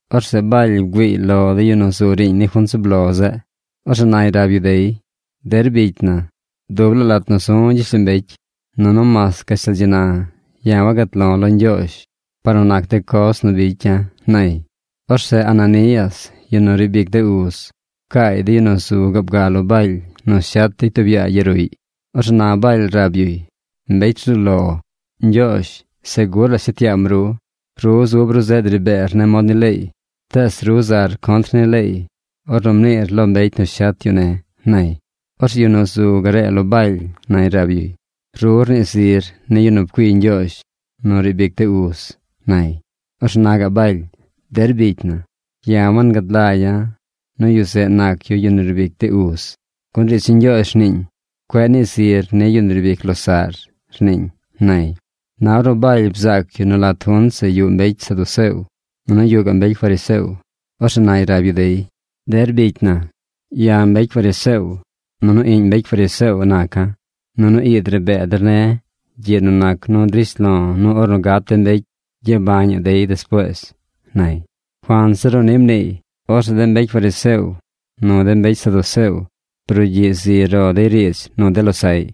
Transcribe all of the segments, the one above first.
Orzeꞌ Baly bgüiiy lo de yu nu zu riiñ ni junt zub lo zeꞌ. Orzeꞌ nay rab yu dey: ―Der bicy na, dub laa lat nu zu̱ gyishlombecy, nunu mas gashtal dzi na ya̱ wagat lo̱ lo Ñgyoozh par nu nac de coz nu bicya̱ ―nay. Orzeꞌ Ananías, yu nu riib ic de uz, pcaay de yu nu zu gaab ga lo Baly nu shet dey tub yaa yaruꞌy. Orzeꞌ na Baly rab yuy: ―¡Mbecy rzuu lo, Ñgyoozh segur la shet yaam ru! Ru zub ru zeꞌ dri beer ne̱ mod ni leey, tees ru zar contr ni leey ornu mniir lo mbecy nu shet yu ne̱ ―nay. Orzeꞌ yu nu zu garee lo Baly nay rab yuy: ―Ru rnii zir ni yu nu pcuii Ñgyoozh nu riib ic de uz ―nay. Orzeꞌ na gaꞌ Baly: ―Der bicy na, ya̱ wangad lagya̱ nu yu zeꞌ nac yu yu nu riib ic de uz, gun riidz ni Ñgyoozh rniiñ: “Cueꞌ nii zir ni yu nu riib ic losaꞌr”, rniiñ ―nay. Na ornu Baly bzaac yu nu lat junt zeꞌ yuꞌ mbecy saduceo, nunu yuꞌ gaꞌ mbecy fariseo, orzeꞌ nay rab yu dey: ―Der bicy na, ya̱ mbecy fariseo, nunu iꞌñ mbecy fariseo naca̱. Nunu ii dri bee der ne̱ gyiꞌ nu nac nu drish lo̱ nu ornu gat de mbecy gyabañaꞌ dey despuees ―nay. Cuanzir nu ni mniiy, orzeꞌ de mbecy fariseo nu de mbecy saduceo brugyiꞌ zi ro dey riidz nu de losaꞌy.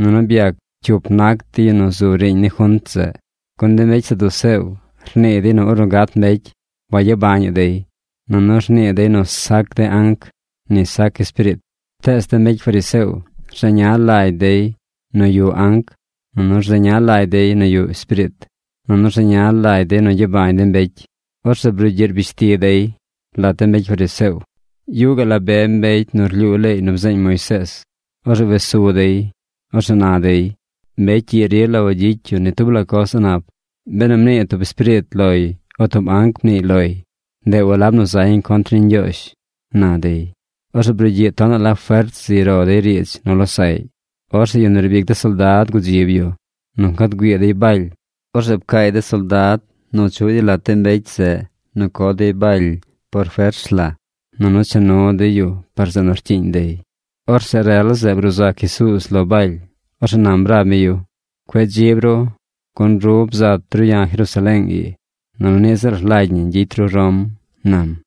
Nunu byac cyup nac de yu nu zu riiñ ni junt zeꞌ. Gun de mbecy saduceo rnii dey nu ornu gat mbecy wayabañaꞌ dey, nunu rnii dey nu sac de anc, ni sac espiriit. Tees de mbecy fariseo rzeña lagy dey nu yuꞌ anc, rzeña lagy dey nu yuꞌ espiriit, nunu rzeña lagy dey nu gyabañaꞌ de mbecy. Orzeꞌ brugyiꞌ rbish ti dey. Lat de mbecy fariseo, yuꞌ gaꞌ la be mbecy nu rlyuu leey nu bzeeñ Moisees. Orzeꞌ wes su dey. Orzeꞌ na dey: ―Mbecy ii rila wagyicy yu ni tub la coz a̱ꞌ nap. Benu mnii tub espiriit loy o tub anc mniiy loy, ndeꞌ walab nu zañ contr ni Ñgyoozh ―na dey. Orzeꞌ brugyiꞌ tonaꞌ la fert zi ro dey riidz nu losaꞌy. Orzeꞌ yu nu riib ic de soldad gudzib yu nu ncad güii dey Baly. Orzeꞌ pcaay de soldad nu chuꞌ dey lat de mbecy zeꞌ nu co dey Baly por fers la, nunu cha nu dey yu par zeꞌ nu rcyiiñ dey. Orzeꞌ rel zeꞌ bruu sac Jesuuz lo Baly. Orzeꞌ nam rab mi yu: ―Cueꞌ dzib ru, gun ru bzat ru ya̱ Jerusaleeng ii nunu niꞌ ziꞌl rlagy ñi gyicy ru Rom ―nam.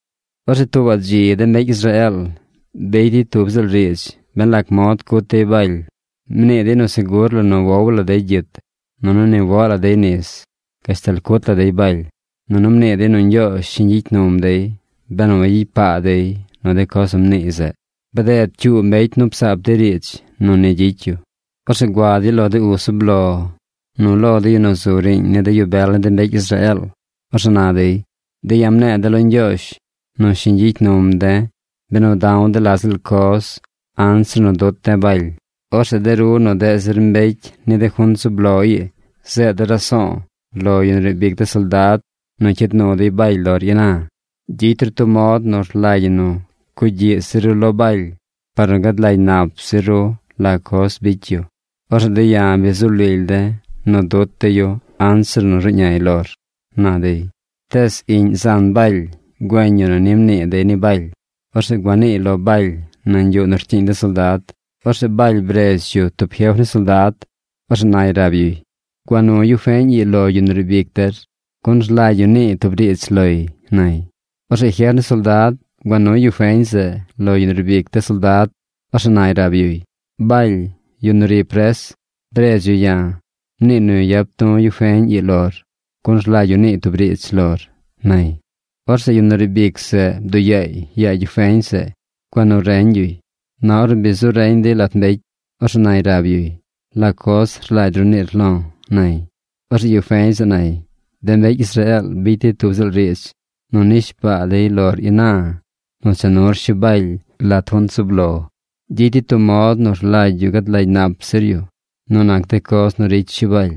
Orzeꞌ tuubaꞌ dzi de mbecy Israeel bicy dey tub ziꞌl riidz ben lac mod cut dey Baly. Mnii dey nu segur la nu wow la dey gyit, nunu ni woꞌ la dey nis gashtal cut la dey Baly. Nunu mnii dey nu Ñgyoozh shiñ gyicy num dey benu wagyicy paa dey nu de coz nu mniiy zeꞌ. Bded cyuu mbecy nu psaap dey riidz nu ni gyicy yu. Orzeꞌ gua dey lo de uz zub lo nu lo de yu nu zu riiñ ni de yu bel ni de mbecy Israeel. Orzeꞌ na dey: ―De̱ ya̱ mne̱e̱ de̱ lo Ñgyoozh nu shiñ gyicy num de̱ benu da̱w de̱ la ziꞌl coz anzir nu dut de̱ Baly. Orzeꞌ de ru nu deꞌ zir mbecy ni de junt zub lo ii zeed der raso̱o̱ lo yu nu riib ic de soldad nu cyid nuy Baly lor ina. Gyicy ru tub mod nu rlagy ñi nu cugyiꞌ zir ru lo Baly par nu gad lagy nap zir ru la coz bicy yu. Orzeꞌ de̱ ya̱ bi zu lily de̱ nu dut de̱ yu anzir nu ruꞌñay lor ―na dey. Tees iꞌñ zan Baly güeñ yu nu ni mnii dey ni Baly. Orzeꞌ gua niiy lo Baly nañ yuꞌ nu rcyiiñ de soldad. Orzeꞌ Baly bredz yu tub jef ni soldad. Orzeꞌ nay rab yuy: ―Gua nu yu feñ ii lo yu nu riib ic der, gun rlagy yu niiy tub riidz loy ―nay. Orzeꞌ jef ni soldad gua nuy yu feñ zeꞌ lo yu riib ic de soldad. Orzeꞌ nay rab yuy: ―Baly, yu nu ri pres, bredz yu ya̱. Mniiy nu yap tu̱ yu feñ ii lor, gun rlagy yu niiy tub riidz lor ―nay. Orzeꞌ yu nu riib ic zeꞌ bduꞌ yaay yaa yu feñ zeꞌ gua nu reñ yuy. Na ornu bi zu reñ dey lat mbecy. Orzeꞌ nay rab yuy: ―¿La coz rlagy ru niir lo̱? ―nay. Orzeꞌ yu feñ zeꞌ nay: ―De mbecy Israeel bicy dey tub ziꞌl riidz nu nishbaa dey lor ina nu cha nur Shi Baly lat junt zub lo. Gyicy dey tub mod nu rlagy yu gad lagy nap zir yu nu nac de coz nu ricy Shi Baly.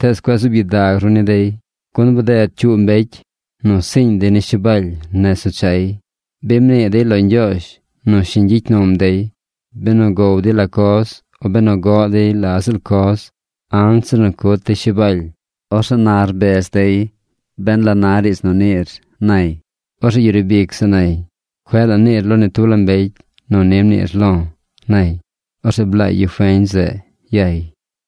Tees cueꞌ zuub gyidag ru ni dey, gun bded cyuu mbecy nu siiñ dey ni Shi Baly nez nu chay. Bi mnii dey lo Ñgyoozh nu shiñ gyicy num dey benu gow dey la coz o benu goꞌ dey la ziꞌl coz anzir nu cut dey Shi Baly. Orzeꞌ na rbez dey ben la na riidz nu niir ―nay. Orzeꞌ yu riib ic zeꞌ nay: ―Cueꞌ la niir lo ni tub la mbecy nu ni mniir lo̱ ―nay. Orzeꞌ blaay yu feñ zeꞌ yay.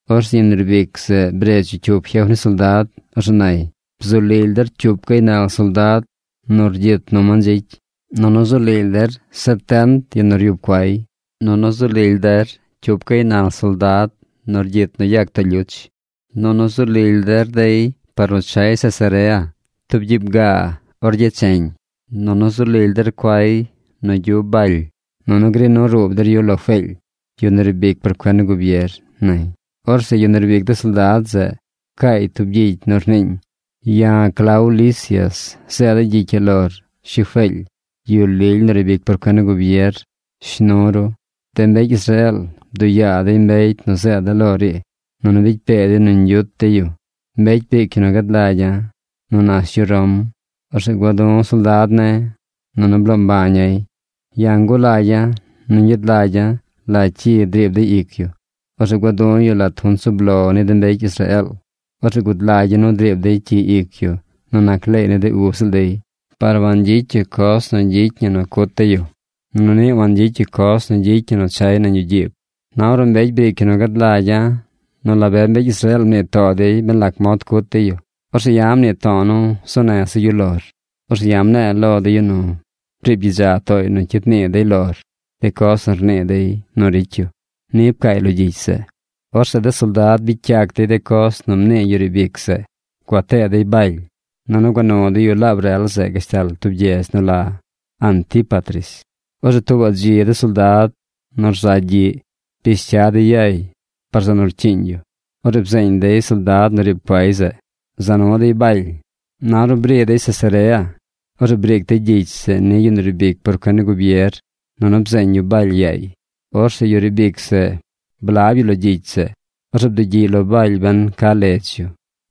Orzeꞌ yu nu riib ic zeꞌ bredz yu cyup jef ni soldad. Orzeꞌ nay: ―Bzu lily der cyup gaynal soldad nu rgyit nu mandzicy, nunu zu lily der setent de yu nu ryub cuay, nunu zu lily der cyup gaynal soldad nu rgyit nu yag too lyuch, nunu zu lily der dey par nu chay Cesarea, tub gyiib gaa or becheñ. Nunu zu lily der cuay nu gyub Baly. Nunu gri nu ruub der yu lo Feely, yu nu riib ic por cuen ni gubier ―nay. Orzeꞌ yu riib ic de soldad zeꞌ pcaay tub gyicy nu rniiñ: “Ya̱ Clau Lisias zeeda̱ gyicy ii lor, shi Feely, yu lily nu riib ic por cuen ni gubier. Shnu ru. De mbecy Israeel bduꞌ yaa dey mbecy nu zeeda̱ lor ii, nunu bicy pee dey nu ñgyut dey yu. Mbecy briic yu nu gad lagya̱ nu nash yu Rom. Orzeꞌ gua̱ du̱ soldad ne̱, nunu blo̱o̱ mbaña̱y. Ya̱ ngulagya̱ nu ñgyad lagya̱ la cyi driib dey ic yu. Orzeꞌ gua̱ du̱ yu lat junt zub lo ni de mbecy Israeel. Orzeꞌ gud lagya̱ nu driib dey cyi ic yu nu nac leey ni de ub ziꞌl dey. Par wangyicy yu coz nu gyicy ñi nu cut dey yu. Nunu niꞌ wangyicy yu coz nu gyicy ñi nu chay nañ yuꞌ gyiib. Na ornu mbecy briic yu nu gad lagya̱ nu la be mbecy Israeel mnii too dey ben lac mod cut dey yu, orzeꞌ ya̱ mnii to̱o̱ nu zuu neza̱ yu lor. Orzeꞌ ya̱ mne̱e̱ lo de yu nu briib gyidza tooy nu cyid nii dey lor de coz nu rnii dey nu ricy yu.” Ni pcaay lo gyicy zeꞌ. Orzeꞌ de soldad bicy yac dey de coz nu mnii yu riib ic zeꞌ. Gua tee dey Baly, nunu gua nu dey yu laab rel zeꞌ gashtal tub gyedz nu la Antípatris. Orzeꞌ tuubaꞌ dzi de soldad nu rza gyiꞌ bish cya dey yay par zeꞌ nu rcyiiñ yu. Orzeꞌ byeeñ de soldad nu riib cuay zeꞌ. Za nu dey Baly. Na ornu bri dey Cesarea, orzeꞌ briic dey gyicy zeꞌ ni yu nu riib ic por cuen ni gubier, nunu bzeeñ yu Baly yaay. Orzeꞌ yu riib ic zeꞌ blab yu lo gyicy zeꞌ. Orzeꞌ bdugyiꞌy lo Baly ben ca ledz yu.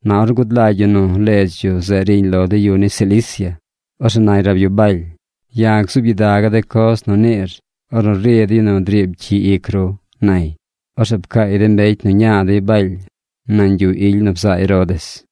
Na ornu gud lagy yu nu ledz yu zeꞌ riñ lo de yu ni Cilicia, orzeꞌ nay rab yu Baly: ―Ya̱ gzuub gyidaga̱ de coz nu niir ornu ri de yu nu driib cyi ic ru ―nay. Orzeꞌ pcaay de mbecy nu ña dey Baly nañ yuꞌ ily nu bzaa Herodes.